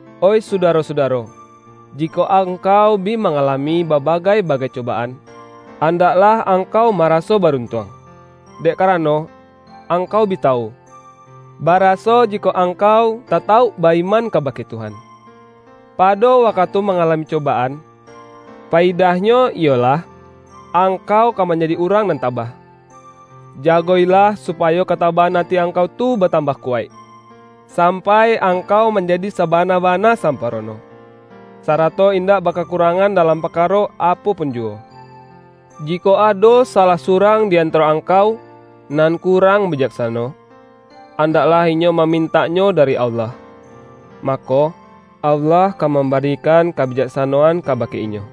Oih sudaro-sudaro! Jikok angkau bi mangalami babagai-bagai cobaan, andaklah angkau maraso baruntuang. Dek karano angkau bi tawu, baraso jikok angkau tatauk ba-iman kabake Tuhan, pado wakatu mangalami coba-an, payidahnyo iyolah: angkau ka man-jadi urang nan tabah. Jago-ilah, supa-yo katabahan ati angkau tu batambah kuwaik, sampai angkau manjadi saba-na-bana samparono, sarato indak ba-kakurangan dalam parkaro apo pun ju-wo. Jikok ado salah surang di antaro angkau, nan kurang bijaksano, andak-lah inyo mamintaknyo dari Allah, ma-ko, Allah ka mambarikan kabijaksano-an kabake inyo;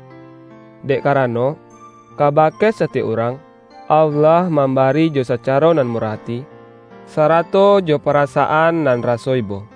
dek karano, kabake satiyok urang, Allah mambari jo sacaro nan murah ati, sarato jo parasaan nan raso ibo.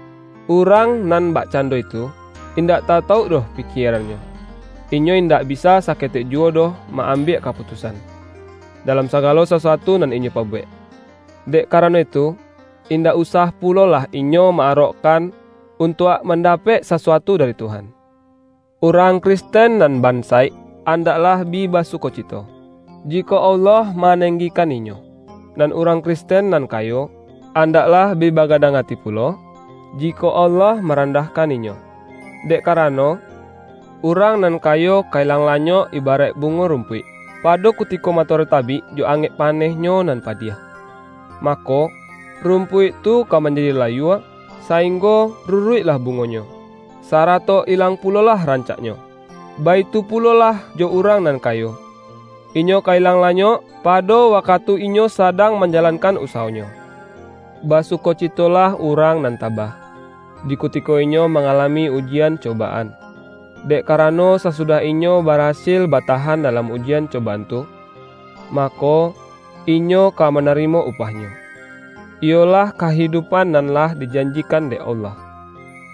Urang nan bakcando itu, in-dak tatauk doh pikierannyo; inyo indak bisa saketek juwo doh ma-ambiak ka-putusan, dalam sagalo sasuatu nan inyo pabuwek. Dek karano itu, indak usah pulolah inyo ma-arokkan, untuak man-dapek sasuatu dari Tuhan. Urang Kristen nan bansaik, an-daklah bi basukocito, jikok Allah manenggikan inyo. Nan urang Kristen nan kayo, andaklah bi bagadang ati pulo, jikok Allah marandahkan inyo. Dek karano, urang nan kayo ka ilang-lanyok ibaraik bungo rumpuik. Pa-do kutiko matoari tabik jo angek pa-nehnyo nan padiah, mako, rumpuik tu ka manjadi layua, sainggo ruruik-lah bungonyo, sarato ilang pulolah rancaknyo. Baitu pulolah jo urang nan kayo; inyo ka ilang-lanyok, pa-do wakatu inyo sadang manjalankan usawonyo. Basukocitolah urang nan tabah, di kutiko inyo mangalami ujian coba-an. Dek karano, sasudah inyo barasil batahan dalam ujian cobaan tu, ma-ko, inyo ka manarimo upahnyo, iyo-lah kahidupan nan lah dijanjikan dek Allah,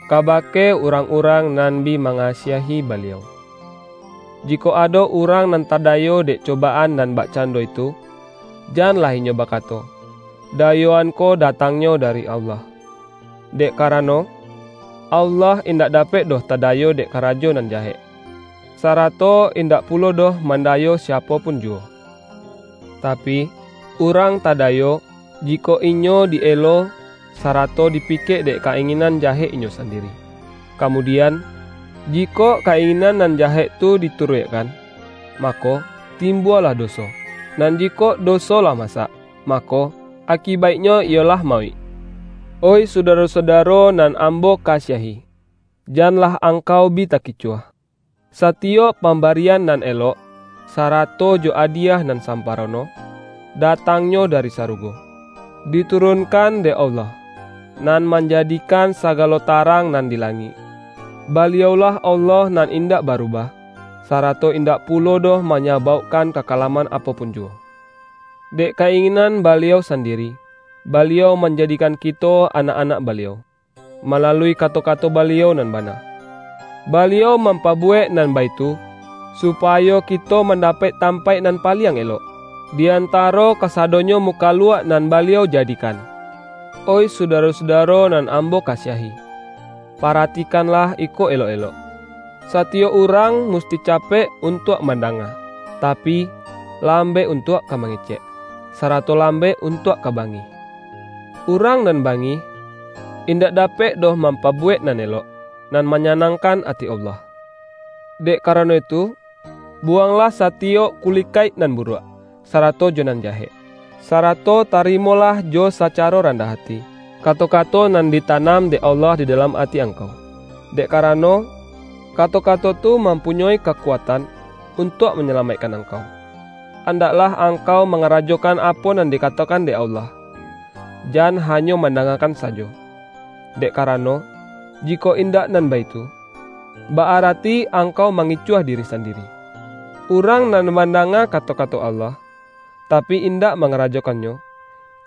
kabake urang-urang nan bi ma-ngasiahi Baliau. Jikok ado urang nan tadayo dek cobaan nan bakcan-do itu, janlah inyo bakato,”Dayo-an ko datangnyo dari Allah,” dek kara-no, Allah indak dapek doh tadayo dek karajo nan jahek, sarato indak pulo doh mandayo siapo pun juwo. Tapi, urang tadayo, jikok inyo di-elo, sarato dipikek dek ka-inginan ja-hek inyo sandiri. Kamudian, jikok ka-inginan nan jahek tu dituruikkan, mako, timbualah doso; nan jikok do-so lah masak, mako, akibaiknyo iyo-lah mauik. Oih sudaro-sudaro nan ambo kasiahi, janlah angkau bi takicuah! Satiyok pambarian nan elok, sa-rato jo adiyah nan samparono, da-tangnyo dari sarugo, diturunkan dek Allah, Nan Manjadikan sagalo tarang nan di langik. Baliau-lah Allah nan in-dak barubah, sarato indak pulo doh manyabaukkan kakalaman apo pun juwo. Dek ka-inginan Baliau sandi-ri, Baliau manjadikan kito anak-anak Baliau, malalui kato-kato Baliau nan bana. Baliau mampabuwek nan baitu, supayo kito mandapek tampaik nan paliang elok, di antaro kasadonyo mukaluak nan Baliau jadikan. Oih sudaro-sudaro nan ambo kasiahi, paratikanlah iko elok-elok! Satiyok urang musti capek untuak mandanga, tapi, lambek untuak ka mangecek, sarato lambek untuak ka bangih. Urang nan bangih, indak dapek doh mampabuwek nan elok, nan manyanangkan ati Allah. Dek karano itu, buwanglah satiyok kuli-kaik nan buruak, sarato jo nan jahek. Sarato tarimolah jo sacaro randah ati, kato-kato nan ditanam dek Allah di dalam ati angkau, dek karano, kato-kato tu mampunyoi kakuatan untuak manyalamaikkan angkau. Andaklah angkau mangarajokan apo nan dikatokan dek Allah, jan ha-nyo mandangakan sajo, dek karano, ji-kok indak nan baitu, ba-arati angkau mangicuah diri sandiri. Urang nan mandanga kato-kato Allah, tapi, indak mangarajokannyo,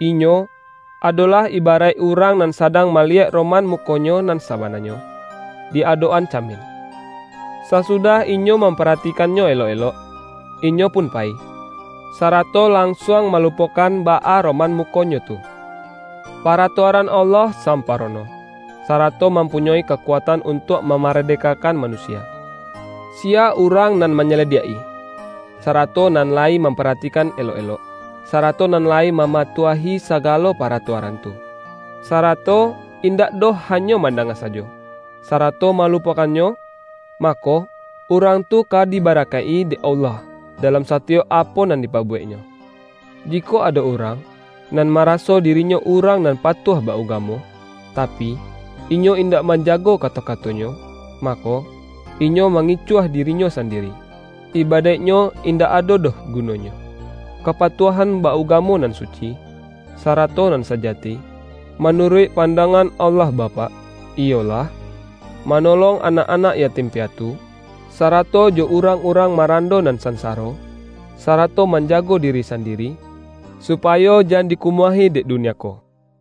inyo, adolah iba-raik urang nan sadang maliyek roman mukonyo nan sabananyo, di adok-an camin. Sasudah inyo mamparatikan-nyo elok-elok, inyo pun payi, sarato lansuang malupokan baa roman mu-konyo tu. Paratuaran Allah sampa-rono, sarato mampunyoi kakuatan un-tuak mamaradekakan manusia. Siya urang nan manyalidiak-i, sarato nan layi mamparatikan elok-elok, sarato nan layi mamatuahi sagalo paratua-ran tu, sarato indak doh hanyo manda-nga sajo, sarato malupokannyo, mako, urang tu ka dibarakaik-i dek Allah, da-lam satiyok apo nan dipabuweknyo. Jikok ado urang nan maraso di-rinyo urang nan patuah ba-ugamo, tapi, inyo indak manjago kato-kato-nyo, mako, inyo mangicuah dirinyo sandiri; ibadaiknyo indak ado doh gu-nonyo. Kapatuahan ba-ugamo nan suci, sarato nan sajati manuruik pan-dangan Allah Bapak, iyolah: mano-long anak-anak yatim piatu, sarato jo urang-urang marando nan sansa-ro, sarato manjago diri sandiri, supa-yo jan dikumuahi dek dunia ko.